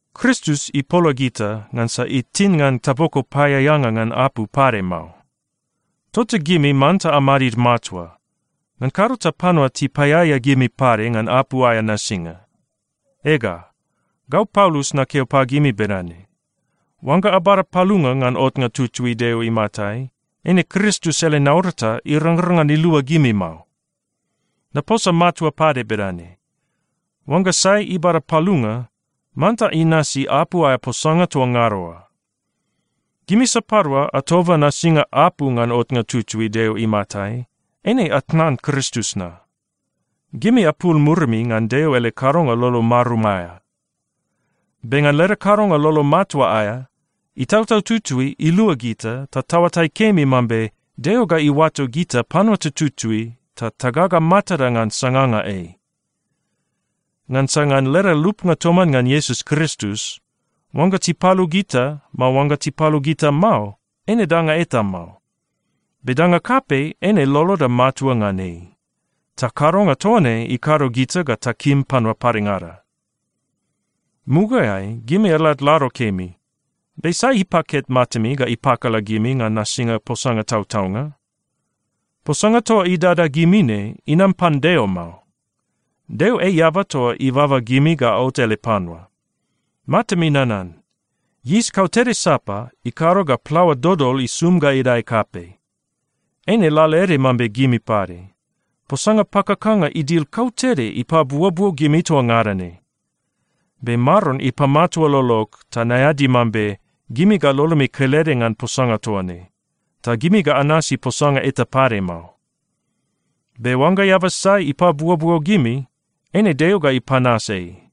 Kristus ipola gita, ngansa itin ngan taboko paeaeanga ngan apu pade mao. Tota gimi manta amadid matua, ngan kado ta panua tipaeaea gimi pade ngan apu aea nasinga. Ega, gau Paulus nakeo pagimi bedane: Oangga abada palunga ngan otnga tutui Deo imatai, eine Kristus ele naurata irangrang ngan ilua gimi mao. Naposa matua pade bedane: Oangga sai ibada palunga, manta inasi apu aea posanga toa ngada oa. Gimi sapadua atoba nasinga apu ngan otnga tutui Deo imatai, eine atnan Kristus na. Gimi apul murimi ngan Deo ele kadonga lolo marum aea. Be ngan leda kadonga lolo matua aea, Itautau Tutui ilua gita ta taoatai kemi mambe Deo ga iuato gita panua tututui ta tagaga matada ngan sanganga ei. Ngansa ngan leda lupnga toman ngan Iesus Kristus, oangga tipalu gita, mao oangga tipalu gita mao, eine danga eta mao. Be danga kapei eine loloda matua ngan ei, ta kadonga toa ne ikado gita ga takim panua padengada. Mugaeai gimi aladlado kemi, be sai ipaket matami ga ipakala gimi ngan nasinga posanga tautaunga? Posanga toa idada gimi ne, inam pan Deo mao. Deo ei eaba toa ibaba gimi ga aot ele panua. Matami nanan. Yis kautede sapa ikado ga plaoa dodol isum ga idae kapei. Eine lalaede mambe gimi pade. Posanga pakakanga idil kautede ipabuobuo gimi toa ngada ne. Be Maron ipamatua lolog ta naeadi mambe gimi ga lolomi kelede ngan posanga toa ne, ta gimi ga anasi posanga eta pade mao. Be oangga eaba sai ipabuobuo gimi, eine Deo ga ipanas ei.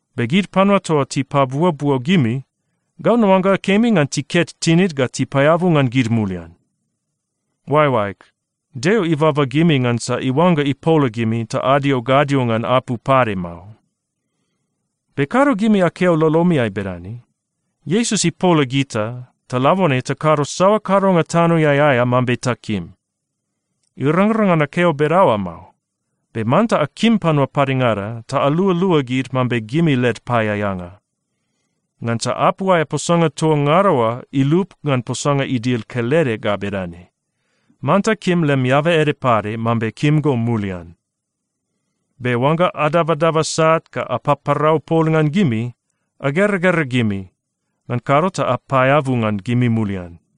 Be gid panua toa tipabuobuo gimi, gau naoangga kemi ngan tiket tinid ga tipaeabu ngan gid mulian! Oaeoaeg, Deo ibaba gimi ngansa iuangga ipola gimi ta adio gadio ngan apu pade mao. Be kado gimi akeo lolomiai bedane, “Iesus ipola gita, ta labone takado saoa kadonga tanoeai aea mambe takim.” Irangrang ngan akeo bedaoa mao. Be manta akim panua padengada ta alualua gid mambe gimi led paeaeanga. Ngansa apu aea posanga toa ngada oa ilup ngan posanga idil kelede ga bedane, “Manta kim lem eaba ede pade mambe kim go mulian.” Be oangga adabadaba sat ga apaparau pol ngan gimi, ageragera gimi, ngan kado ta apaeabu ngan gimi mulian.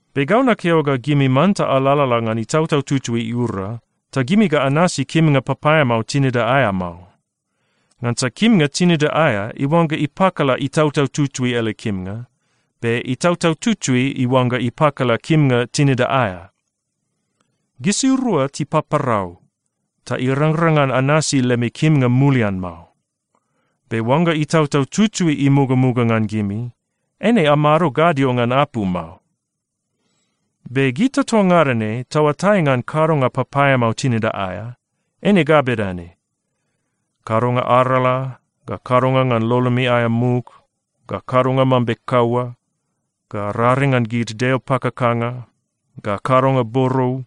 Be gau nakeo ga gimi manta alalala ngan Itautau Tutui iura, ta gimi ga anasi kimnga papaeamao tinida aea mao. Ngansa kimnga tinida aea iuangga ipakala Itautau Tutui ele kimnga, be Itautau Tutui iuangga ipakala kimnga tinida aea. Gisirua tipaparau, ta irangrang ngan anasi lemi kimnga mulian mao. Be oangga Itautau Tutui imugamuga ngan gimi, eine amado gadio ngan apu mao. Be gita toa ngada ne taoatai ngan kadonga papaeamao tinida aea. Eine ga bedane: kadonga arala, ga kadonga ngan lolomi aea muk, ga kadonga mambe kaua, ga raring ngan gid deo pakakanga, ga kadonga borou,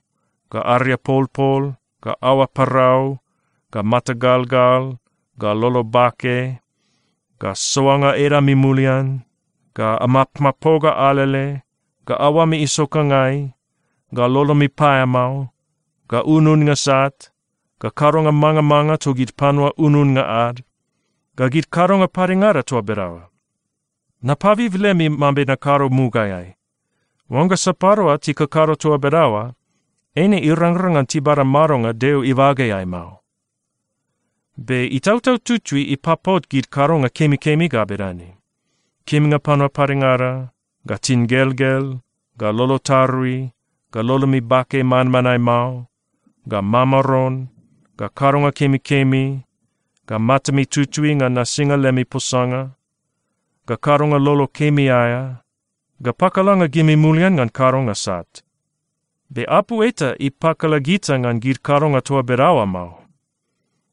ga ariapolpol, ga aoa parau, ga mata galgal, ga lolo bake, ga soanga edami mulian, ga amapmapoga alele, ga aoami isokangai, ga lolomi paeamao, ga ununnga sat, ga kadonga mangamanga togid panua ununnga ad, ga gid kadonga padengada toa bedaoa. Napabib lemi mambe nakado mugaeai, oangga sapadua tikakado toa bedaoa, eine irangrang ngan tibada madonga Deo ibageai mao. Be Itautau Tutui ipapot gid kadonga kemikemi ga bedane: kimnga panua padengada, ga tingelgel, ga lolo tarui, ga lolomi bake manmanae mao, ga mamaron, ga kadonga kemikemi, ga matami tutui ngan nasinga lemi posanga, ga kadonga lolo kemi aea, ga pakalanga gimi mulian ngan kadonga sat. Be apu eta ipakala gita ngan gid kadonga toa bedaoa mao.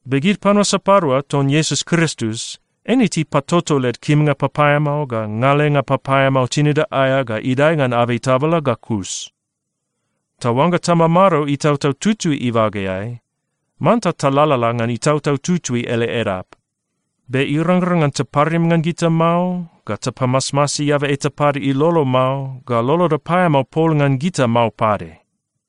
Be gid panua sapadua ton Iesus Kristus, eine tipatoto led kimnga papaeamao ga ngalenga papaeamao tinida aea ga idae ngan abei tabala ga kus. Ta oangga tamamado Itautau Tutui ibageai, manta talalala ngan Itautau Tutui ele edap. Be irangrang ngan taparim ngan gita mao, ga tapamasmasi eaba eta pade ilolo mao, ga loloda paeamao pol ngan gita mao pade.